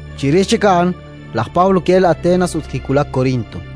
Chirix chik a'an laj Pablo ki'elk Atenas ut kiwulak Korinto.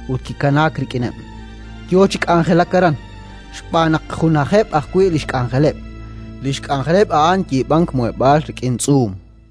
ut kikanaak rik'ineb', yo chi k'anjelak aran, xb'aan naq junajeb' ajwi' li xk'anjeleb'. Li xk'anjeleb' a'an yiib'ank muheb'aal rik'in tz'uum.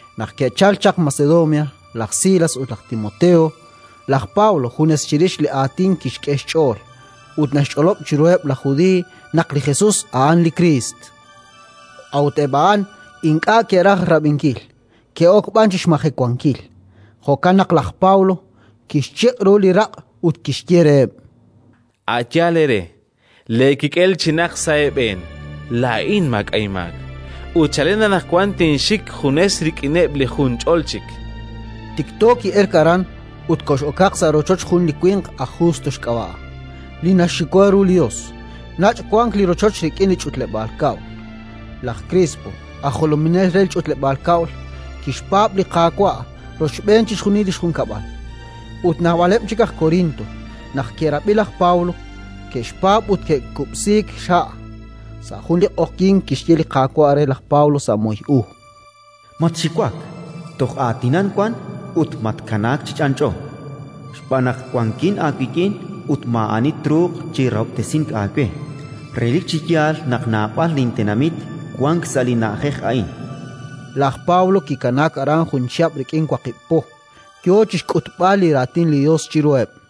Naq ke'chalk chaq Macedonia laj Silas ut laj Timoteo, laj Pablo junes chirix li Aatin kixk'e xch'ool, ut naxch'olob' chiruheb' laj Judiiy naq li Jesus a'an li Kriist. A'ut eb' a'an ink'a' ke'raj rab'inkil, ke'ok b'an chi xmajewankil; jo'kan naq laj Pablo kixchiq' ru li raq' ut kixye reheb': —A' yaal eere. Leekik'el chinaq sa' eeb'een. Laa'in maak'a' inmaak, ut chalen anaqwan tinxik junes rik'ineb' li junch'ol chik. Tikto ki'elk aran ut kox'okaq sa' rochoch jun li winq aj Justo xk'ab'a', li naxxiwa ru li Yos; nach' wank li rochoch rik'in li ch'utleb'aal kab'l. Laj Krispo, aj jolominel re li ch'utleb'aal kab'l, kixpaab' li Qaawa' rochb'een chixjunil li xjunkab'al; ut naab'aleb' chik aj Korinto, naq ke'rab'i laj Pablo, ke'xpaab' ut ke'kub'siik xha'. Sa' jun li q'oqyink kixye li Qaawa' re laj Pablo sa' moy u: “Matxiwak! Toj aatinan wan ut matkanaak chi ch'anch'o, xb'aan naq wankin aawik'in ut maa'ani truuq chi rahob'tesink aawe. Relik chi yaal naq naab'al lintenamit wank sa' li na'ajej a'in”. Laj Pablo kikanaak aran jun chihab' rik'in waqib' po, yo chi xk'utb'al li Raatin li Yos chiruheb'.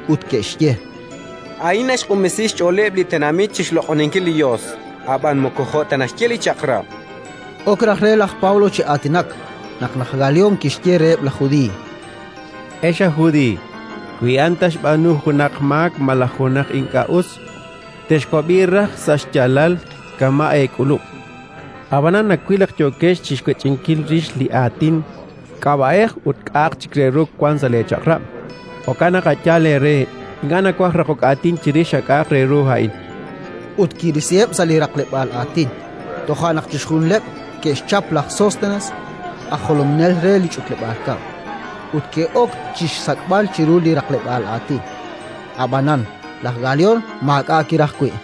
ut ke'xye: —A'in naxq'unb'esi xch'ooleb' li tenamit chi xloq'oninkil li Yos, ab'an moko jo' ta naxye li Chaq'rab'. Ok raj re laj Pablo chi aatinak, naq laj Galión kixye reheb' laj Judiiy: —Ex aj Judiiy, wi a'an ta xb'aanu junaq maak malaj junaq ink'a' us, texwab'i raj sa' xyaalal, kama' eek'ulub'. Ab'anan nawil naq yookex chi xwech'inkil rix li aatin, k'ab'a'ej ut k'a'aq chik re ru wank sa' leeChaq'rab'; jo'kan naq a' yaal eere. Ink'a' nawaj raqok aatin chirix a k'a'aq re ru a'in. Ut kirisiheb' sa' li raqleb'aal aatin. Toja' naq chixjunileb' ke'xchap laj Sóstenes, aj jolominel re li ch'utleb'aal kab'l, ut ke'ok chi xsak'b'al chiru li raqleb'aal aatin. Ab'anan laj Galión maak'a' kiraj wi'.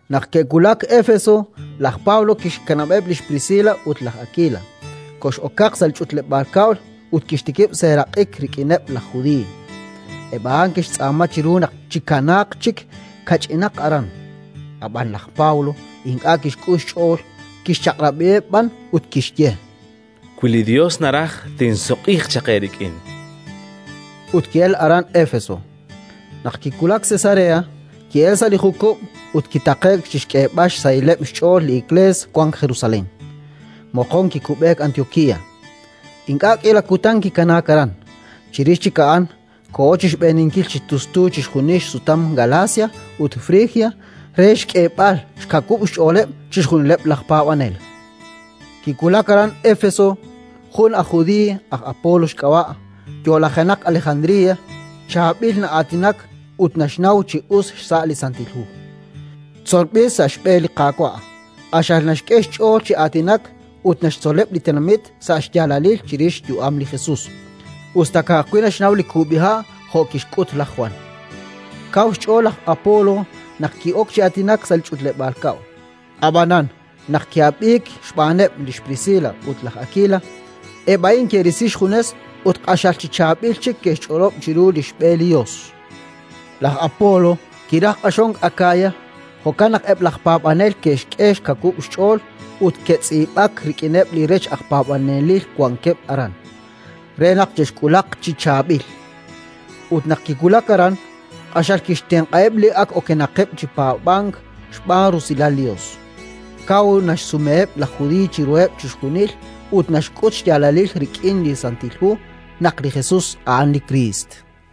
Naq ke'wulak Éfeso, laj Pablo kixkanab'eb' lix Priscila ut laj Akila, kox'okaq sa' li ch'utleb'aal kab'l ut kixtikib' seeraq'ik rik'ineb' laj Judiiy. Eb' a'an ke'xtz'aama chiru naq chikanaaq chik kach'inaq aran, ab'an laj Pablo ink'a' kixk'ul xch'ool, kixchaq'rab'iheb' b'an ut kixye: “Wi li Yos naraj, tinsutq'iiq chaq eerik'in”. Ut ki'elk aran Éfeso. Naq kiwulak Cesarea, ki'elk sa' li jukub' ut kitaqe'k chi xk'eeb'al xsahilaleb' xch'ool li Iklees wank Jerusalén; moqon kikub'eek Antiokía. Ink'a' k'iila kutan kikanaak aran; chirix chik a'an koho chi xb'eeninkil chi tustu chixjunil xsutam Galacia ut Frigia re xk'eeb'al xkawub' xch'ooleb' chixjunileb' laj paab'anel. Kiwulak aran Éfeso jun aj judiiy, aj Apolo xk'ab'a', yo'lajenaq Alejandría, chaab'il na'aatinak ut naxnaw chi us xsa' li Santil Hu. Tzolb'il sa' xb'e li Qaawa', q'axal naxk'e xch'ool chi aatinak ut naxtzoleb' li tenamit sa' xyaalalil chirix xyu'am li Jesus, us ta ka'ajwi' naxnaw li kub'iha' jo' kixk'ut laj Jwan. Kaw xch'ool laj Apolo naq ki'ok chi aatinak sa' li ch'utleb'aal kab'l. Ab'anan naq ki'ab'iik xb'aaneb' lix Priscila ut laj Akila, eb' a'in ke'risi xjunes ut q'axal chi chaab'il chik ke'xch'olob' chiru li xb'e li Yos. Laj Apolo kiraj q'axonk Akaya; jo'kan naq eb' laj paab'anel ke'xk'e xkawub' xch'ool ut ke'tz'iib'ak rik'ineb' li rech aj paab'anelil wankeb' aran, re naq che'xk'ulaq chi chaab'il. Ut naq kiwulak aran, q'axal kixtenq'aheb' li ak okenaqeb' chi paab'ank xb'aan rusilal li Yos: kaw naxsumeheb' laj Judiiy chiruheb' chixjunil ut naxk'ut xyaalalil rik'in li Santil Hu naq li Jesus a'an li Kriist.